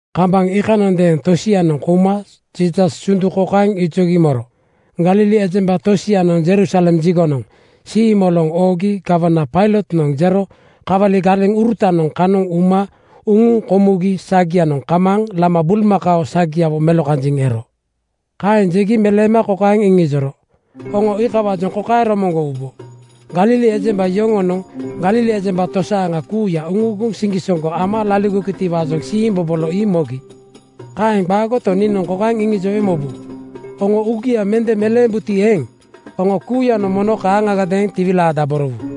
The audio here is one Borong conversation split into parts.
Kambaŋ iikanondeeŋ tosianoŋ kouma Jiisas sundu kokaeŋ ijogi moro, “Galili ejemba tosianoŋ Jerusalem jigonoŋ siimoloŋ oogi gawana Pailotnoŋ jero kawali galeŋurutanoŋ kanoŋ uma uŋuŋ komugi sagia kamaaŋ lama bulmakao sagiawo melokanjiŋ ero.” Kaeŋ jegi meleema kokaeŋ iŋijoro, “Oŋo iikawaajoŋ kokaeŋ romoŋgowubo: Galili ejemba yoŋonoŋ Galili ejemba tosaaŋa kuuya uŋuuguŋ siŋgisoŋgo ama laligogitiwaajoŋ siimbobolo ii mogi. Kaeŋ qaagoto, niinoŋ kokaeŋ iŋijowe mobu: Oŋo uugia mende meleembuti eeŋ, oŋo kuuyanoŋ mono kaaŋagadeeŋ tiwilaadaborowu.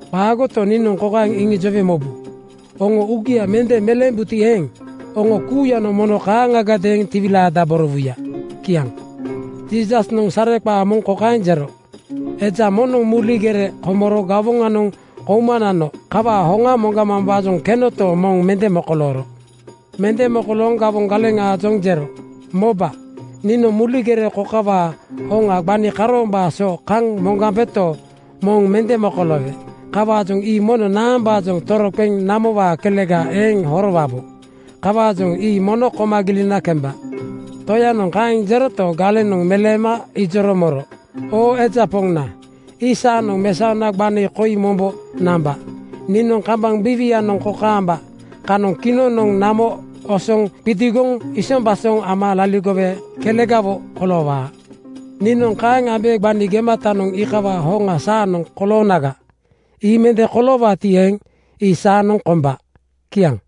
Qaagoto, niinoŋ kokaeŋ iŋijowe mobu: Oŋo uugia mende meleembuti eeŋ, oŋo kuuyanoŋ mono kaaŋagadeeŋ tiwilaadaborowuya.” Kiaŋ. Jiisasnoŋ sareqaa moŋ kokaeŋ jero, “Eja moŋnoŋ muli gere komoro gawoŋanoŋ kouma nano kawaa hoŋa moŋgamambaajoŋ kenoto, moŋ mende mokolooro. Mende mokolooŋ gawoŋ galeŋaajoŋ jero, ‘Moba, niinoŋ muli gere kokawaa hoŋa gbani karoombaa so kaŋ moŋgambeto, moŋ mende mokoloowe. Kawaajoŋ ii mono naambaajoŋ toroqeŋ namowaa kelega eeŋ horowabo. Kawaajoŋ ii mono koma gilina kemba.’ Toyanoŋ kaeŋ jeroto, galenoŋ meleema ijoro moro, ‘Oo eja poŋna, ii saanoŋ mesaona gbani koi mombo namba. Niinoŋ kambaŋ biiwianoŋ kokaamba kanoŋ kinoŋnoŋ namo osoŋ qidigoŋ isombasoŋ ama liligowe kelegawo koloowaa. Niinoŋ kaeŋ ambe gbani gematanoŋ iikawaa hoŋa saanoŋ koloonaga. Ii mende koloowaati eeŋ, ii saanoŋ komba.’” Kiaŋ.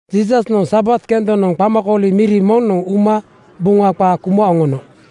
Jiisasnoŋ Sabat kendonoŋ qamakooli miri moŋnoŋ uma Buŋa qaa kuma oŋono.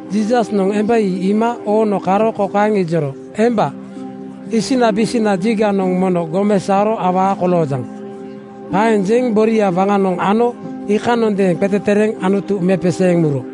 Jiisasnoŋ emba ii iima oono karo kokaeŋ ijoro, “Emba, isinabisina jiganoŋ mono gomesaoro awaa koloojaŋ.” Kaeŋ jeŋ boria waŋanoŋ ano iikanondeeŋ qetetereeŋ Anutu mepeseeŋ muro.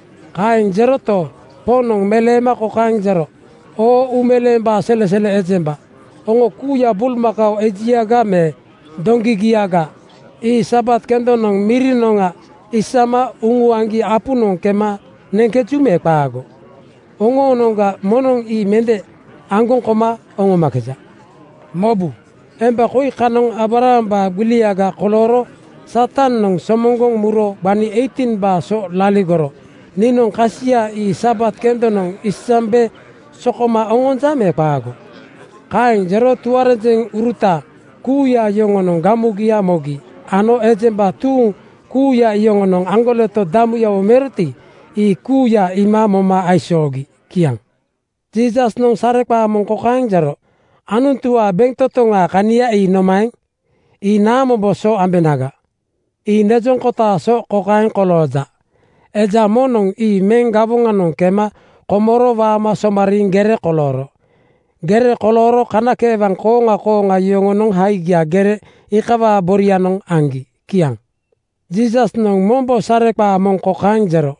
Kaeŋ jeroto, Poŋnoŋ meleema kokaeŋ jero, “Oo uumeleembaa selesele ejemba, oŋo kuuya bulmakao ejiaga me doŋgigiaga ii Sabat kendonoŋ mirinoŋga isama uŋuaŋgi apunoŋ kema neŋkeju me qaago? Oŋoonoŋga moŋnoŋ ii mende aŋgoŋ koma oŋomakeja. Mobu! Emba koi kanoŋ Aabrahambaa gbiliga kolooro Satanoŋ somoŋgoŋ muro gbani 18:baa so laligoro niinoŋ kasia ii Sabat kendonoŋ isambe sokoma oŋonja me qaago?” Kaeŋ jero tuarenjeŋuruta kuuya yoŋonoŋ gamugia mogi ano ejemba tuuŋ kuuya yoŋonoŋ aŋgoleto damuyawo meroti, ii kuuya iima moma aisoogi. Kiaŋ. Jiisasnoŋ sareqaa moŋ kokaeŋ jero, “Anutuwaa bentotoŋaa kania ii nomaeŋ? Ii naamombo so ambenaga? Ii nejoŋ kotaa so kokaeŋ kolooja: Eja moŋnoŋ ii meŋ gawoŋanoŋ kema komoro waama somariiŋ gere kolooro. Gere kolooro kanakeewaŋ kooŋa kooŋa yoŋonoŋ haigia gere iikawaa borianoŋ aŋgi.” Kiaŋ. Jiisasnoŋ mombo sareqaa moŋ kokaeŋ jero,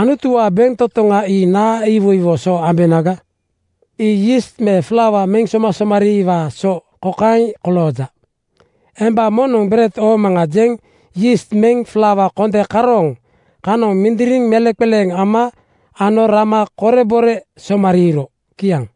“Anutuwaa bentotoŋa ii naa iwoiwo so ambenaga? Ii yiist me flaua meŋ somasomariiwaa so kokaeŋ kolooja: Emba moŋnoŋ ‘Bered oomaŋa,’ jeŋ yiist meŋ flaua konde karooŋ kanoŋ mindiriŋ meleŋqeleeŋ ama ano rama korebore somariiro.” Kiaŋ.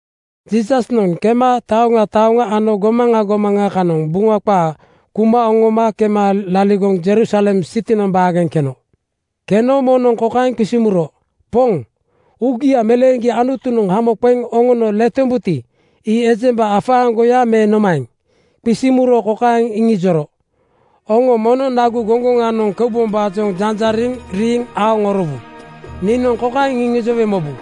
Jiisasnoŋ kema taoŋa taoŋa ano gomaŋa gomaŋa kanoŋ Buŋa qaa kuma oŋoma kema laligoŋ Jerusalem sitinoŋ baageŋ keno. Keno moŋnoŋ kokaeŋ qisiŋ muro, “Poŋ, uugia meleeŋgi Anutunoŋ hamo qeŋ oŋono letombuti, ii ejemba afaaŋgoya me nomaeŋ?” Qisiŋ muro kokaeŋ iŋijoro, “Oŋo mono nagu goŋgoŋanoŋ keubombaajoŋ janjariŋ riiŋ aoŋorowu. Niinoŋ kokaeŋ iŋijowe mobu: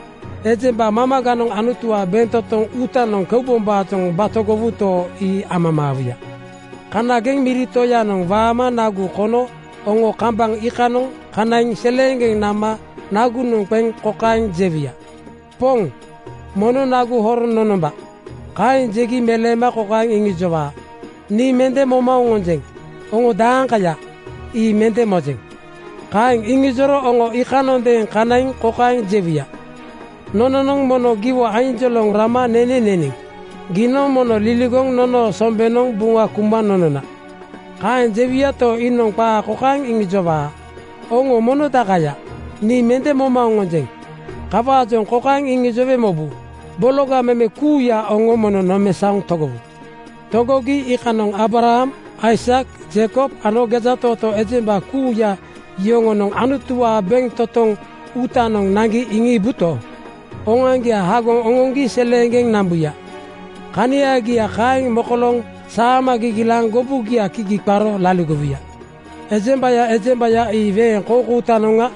Ejemba mamaganoŋ Anutuwaa bentotoŋ uutanoŋ keubombaajoŋ batogowuto, ii amamaawuya. Kanageŋ miri toyanoŋ waama nagu konogo oŋo kambaŋ iikanoŋ kanaiŋ seleeŋgeŋ nama nagunoŋ qeŋ kokaeŋ jewuya, ‘Poŋ, mono nagu horoŋ nonomba.’ Kaeŋ jegi meleema kokaeŋ iŋijowaa, ‘Nii mende moma oŋonjeŋ. Oŋo daaŋkaya, ii mende mojeŋ.’ Kaeŋ iŋijoro oŋo iikanondeeŋ kanaiŋ kokaeŋ jewuya, ‘Nononoŋ mono giwo ainjoloŋ rama nene neniŋ. Giinoŋ mono liligoŋ nonoo sombenoŋ Buŋa kuma nonona.’ Kaeŋ jewuyato, iinoŋ qaa kokaeŋ iŋijowaa, ‘Oŋo mono dakaya, nii mende moma oŋonjeŋ. Kawaajoŋ kokaeŋ iŋijowe mobu: Bologa meme kuuya, oŋo mono nomesaoŋ togowu.’ “Togogi iikanoŋ Aabraham, Aisak, Jeikob ano gejatootoo ejemba kuuya yoŋonoŋ Anutuwaa bentotoŋ uutanoŋ naŋgi iŋiibuto, oŋoaŋgia hagoŋ oŋoŋgi seleeŋgeŋ nambuya. Kaniagia kaeŋ mokolooŋ saama gigilaaŋ gobugia kigi qaro laligowuya. Ejembaya ejembaya ii weeŋ koukoutanoŋga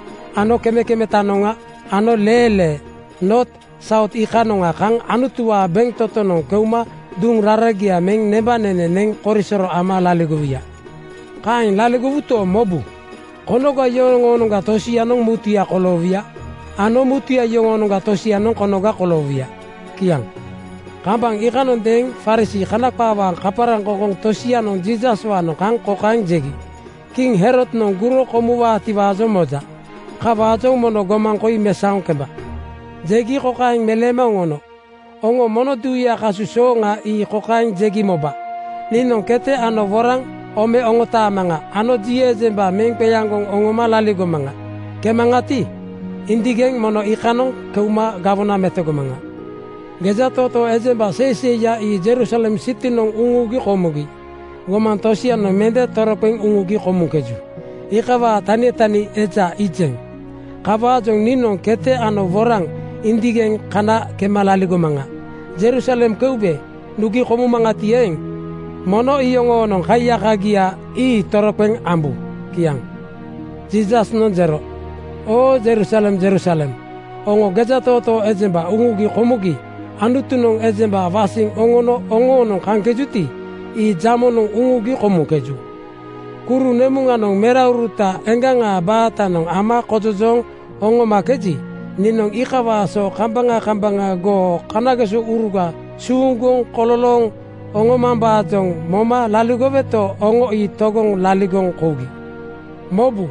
ano kemekemetanoŋga ano leelee Noot Saut iikanoŋa kaŋ Anutuwaa bentotonoŋ keuma duŋ raragia meŋ nembanene neŋ korisoro ama laligowuya. Kaeŋ laligowuto, mobu! Konoga yoŋoonoŋga tosianoŋ mutuya koloowuya ano mutuya yoŋoonoŋga tosianoŋ konoga koloowuya.” Kiaŋ. Kambaŋ iikanondeeŋ Farisii (Kana qaawaa kaparaŋkoŋkoŋ) tosianoŋ Jiisaswaanoŋ kaŋ kokaeŋ jegi, “Kiŋ Herodnoŋ guro komuwaatiwaajoŋ moja. Kawaajoŋ mono gomaŋ koi mesaoŋ kemba.” Jegi kokaeŋ meleema oŋono, “Oŋo mono duuyaa kasu sooŋa ii kokaeŋ jegi moba, ‘Moba! Niinoŋ kete ano woraŋ ome oŋotaamaŋa ano ji ejemba meŋ qeaŋgoŋ oŋoma laligomaŋa. Kemaŋati, indigeŋ mono iikanoŋ keuma gawona metogomaŋa.’ “Gejatootoo ejemba seiseiya ii Jerusalem sitinoŋ uŋugi komugi. Gomaŋ tosianoŋ mende toroqeŋ uŋugi komuŋkeju, iikawaa tanitani eja iijeŋ. Kawaajoŋ niinoŋ kete ano woraŋ indigeŋ kana kema laligomaŋa. Jerusalem keube nugi komumaŋati eeŋ, mono iyoŋoonoŋ kaiyakagiaga ii toroqeŋ ambu.” Kiaŋ. Jiisasnoŋ jero, “Oo Jerusalem Jerusalem, oŋo gejatootoo ejemba uŋugi komugi Anutunoŋ ejemba wasiŋ oŋono oŋoonoŋ kaŋkejuti, ii jamonoŋ uŋugi komuŋkeju. Kuru nemuŋanoŋ merauruta eŋgaŋa baatanoŋ ama kojojooŋ oŋomakeji, niinoŋ iikawaa so kambaŋa kambaŋa goo kanagesouruga suuŋgoŋ kololooŋ oŋomambaajoŋ moma laligoweto, oŋo ii togoŋ laligoŋ kougi. Mobu!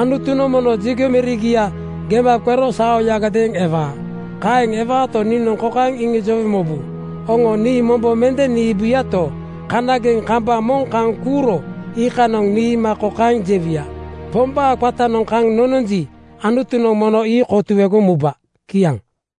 ‘Anutunoŋ mono jigo mirigia gema qero saoyagadeeŋ ewaa.’ Kaeŋ ewaato, niinoŋ kokaeŋ iŋijowe mobu, Oŋo nii mombo mende niibuyato, kanageŋ kambaŋ moŋ kaŋ kuuro iikanoŋ niima kokaeŋ jewuya, ‘Pombaa qatanoŋ kaŋ nononji, Anutunoŋ mono ii kotuegoŋ muba.’ Kiaŋ.”